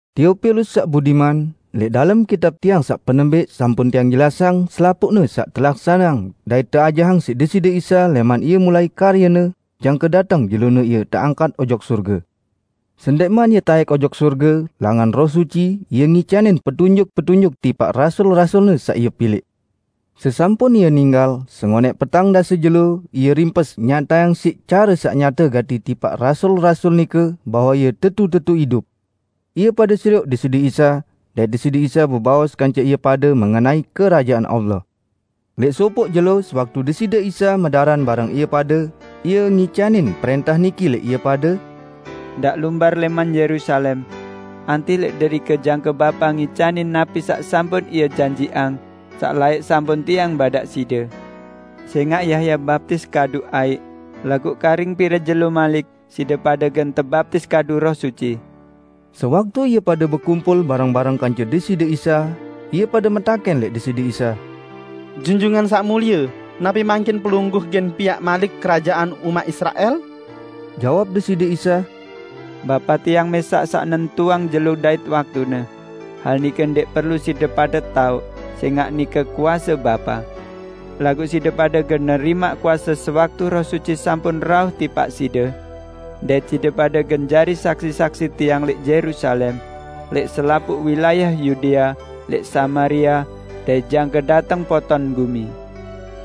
Teopilus saq budiman, lẽq dalem kitab tiang saq penembẽq sampun tiang jelasang selapuqne saq telaksaneang dait teajahang siq Deside Isa lẽman Ie mulai karye-Ne, jangke dateng jelone Ie teangkat ojok sorge. Sendẽqman Ie taẽk ojok sorge, langan Roh Suci Ie ngicanin petunjuk-petunjuk tipaq rasul-rasul-Ne saq Ie pilẽq. Sesampun Ie ninggal, sengonẽq petang dase jelo Ie rimpes nyatayang siq care saq nyate gati tipaq rasul-rasul nike bahwe Ie tetu-tetu idup. Ie pade serioq Deside Isa, dait Deside Isa bebaos kance ie pade mengenai Kerajaan Allah. Lẽq sopoq jelo sewaktu Deside Isa medaran bareng ie pade, Ie ngicanin prẽntah niki lẽq ie pade, "Ndaq lumbar lẽman Yerusalem. Antih lẽq derike jangke Bapa ngicanin napi saq sampun Ie janjiqang, saq laẽq sampun Tiang badaq side. Sẽngaq Yahya baptis kadu aiq, laguq karing pire jelo malik side pade gen tebaptis kadu Roh Suci." Sewaktu ie pade bekumpul bareng-bareng kance Deside Isa, ie pade metakẽn lẽq Deside Isa, "Junjungan Saq Mulie, napi mangkin Pelungguh gen piaq malik kerajaan umaq Israel?" Jawab Deside Isa, "Bapa Tiang mẽsaq saq nentuang jelo dait waktune. Hal nike ndẽq perlu side pade taoq, sẽngaq nike kuase Bapa. Laguq side pade gen nerimaq kuase, sewaktu Roh Suci sampun rauh tipaq side. Dait side pade gen jari saksi-saksi Tiang lẽq Yerusalem, lẽq selapuq wilayah Yudea, lẽq Samaria, dait jangke dateng poton gumi."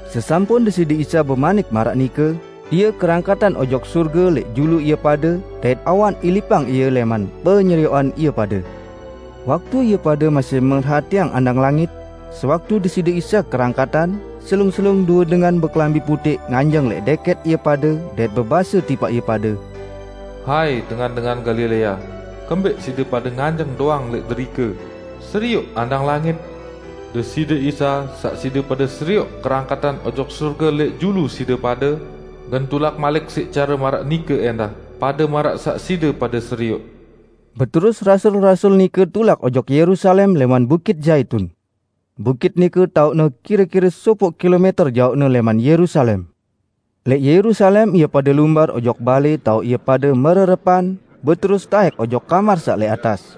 Sesampun Deside Isa bemanik maraq nike, Ie kerangkatan ojok sorge lẽq julu ie pade, dait awan ilipang Ie lẽman penyerioqan ie pade. Waktu ie pade masih merhatiang andang langit, sewaktu Deside Isa kerangkatan, selung-selung due dengan bekelambi putẽq nganjeng lẽq dẽkẽt ie pade, dait bebase tipaq ie pade, "Hai, dengan-dengan Galilea, kembẽq side pade nganjeng doang lẽq derike serioq andang langit? Deside Isa, saq side pade serioq kerangkatan ojok sorge lẽq julu side pade, gen tulak malik siq care maraq nike ẽndah pade maraq saq side pade serioq." Beterus rasul-rasul nike tulak ojok Yerusalem lẽman Bukit Zaitun. Bukit nike taoqne kire-kire sopoq kilomẽter jaoqne lẽman Yerusalem. Lẽq Yerusalem ie pade lumbar ojok balẽ taoq ie pade mererepan, beterus taẽk ojok kamar saq lẽq atas.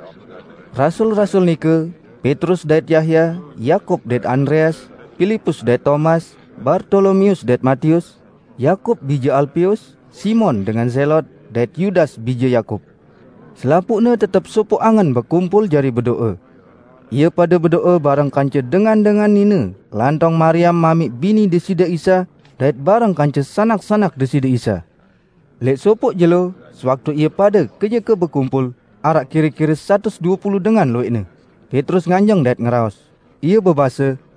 Rasul-rasul nike, Petrus dait Yahya, Yakub dait Andreas, Pilipus dait Tomas, Bartolomeus dait Matius, Yakub bije Alpeus, Simon dengan Zelot dait Yudas bije Yakub; selapuqne tetep sopoq angen bekumpul jari bedo'e. Ie pade bedo'e bareng kance dengan-dengan nine lantong Mariam mamiq bini Deside Isa, dait bareng kance sanak-sanak Deside Isa. Lẽq sopoq jelo, sewaktu ie pade kenyeke bekumpul -- araq kire-kire satus due pulu dengan luwẽqne -- Petrus nganjeng dait ngeraos. Ie bebase,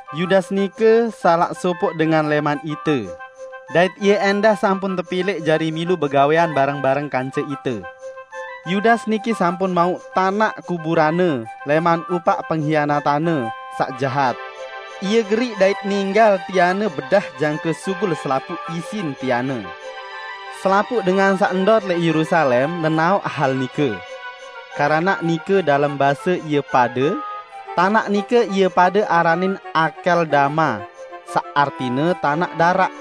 Yudas nike salaq sopoq dengan lẽman ite, dait ie ẽndah sampun tepilẽq jari milu begawẽan bareng-bareng kance ite." ( Yudas niki sampun mauq tanaq kuburanne lẽman upaq penghianatanne saq jahat. Ie geriq dait ninggal tianne bedah jangke sugul selapuq isin tianne. Selapuq dengan saq ndot lẽq Yerusalem nenaoq hal nike. Keranaq nike dalem base ie pade, tanaq nike ie pade aranin Akeldama, saq artine 'Tanaq Daraq'.)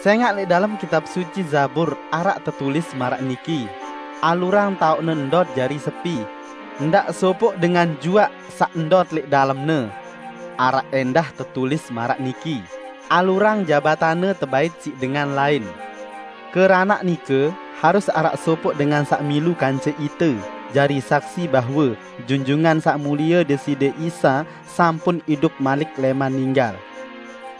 "Sẽngaq lẽq dalem Kitab Suci Zabur araq tetulis maraq niki, 'Alurang taoqne ndot jari sepi; ndaq sopoq dengan juaq saq ndot lẽq dalemne.' Araq ẽndah tetulis maraq niki, 'Alurang jabatanne tebait siq dengan lain.' Keranaq nike, harus araq sopoq dengan saq milu kance ite jari saksi bahwe Junjungan Saq Mulie Deside Isa sampun idup malik lẽman ninggal.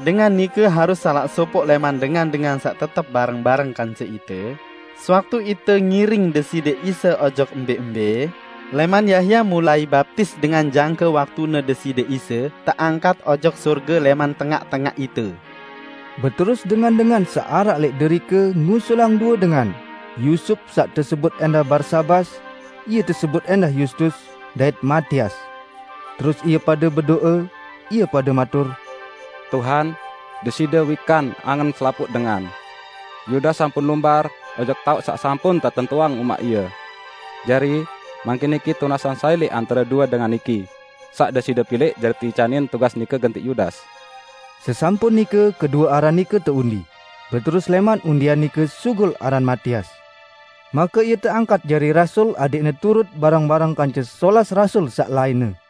Dengan nike harus salaq sopoq lẽman dengan-dengan saq tetep bareng-bareng kance ite sewaktu ite ngiring Deside Isa ojok embẽ-embẽ, lẽman Yahya mulai baptis dengan jangke waktune Deside Isa teangkat ojok sorge lẽman tengaq-tengaq ite." Beterus dengan-dengan saq araq lẽq derike ngusulang due dengan, Yusup saq tesebut ẽndah Barsabas (ie tesebut ẽndah Yustus), dait Matias. Terus ie pade bedo'e, ie pade matur, "Tuhan, Deside wikan angen selapuq dengan. Yudas sampun lumbar ojok taoq saq sampun tetentuang umaq ie. Jari, mangkin niki tunasang sai lẽq antare due dengan niki saq Deside pilẽq jari teicanin tugas nike gentiq Yudas." Sesampun nike kedue aran nike teundi, beterus lẽman undian nike sugul aran Matias. Make ie teangkat jari rasul adẽqne turut bareng-bareng kance solas rasul saq lainne.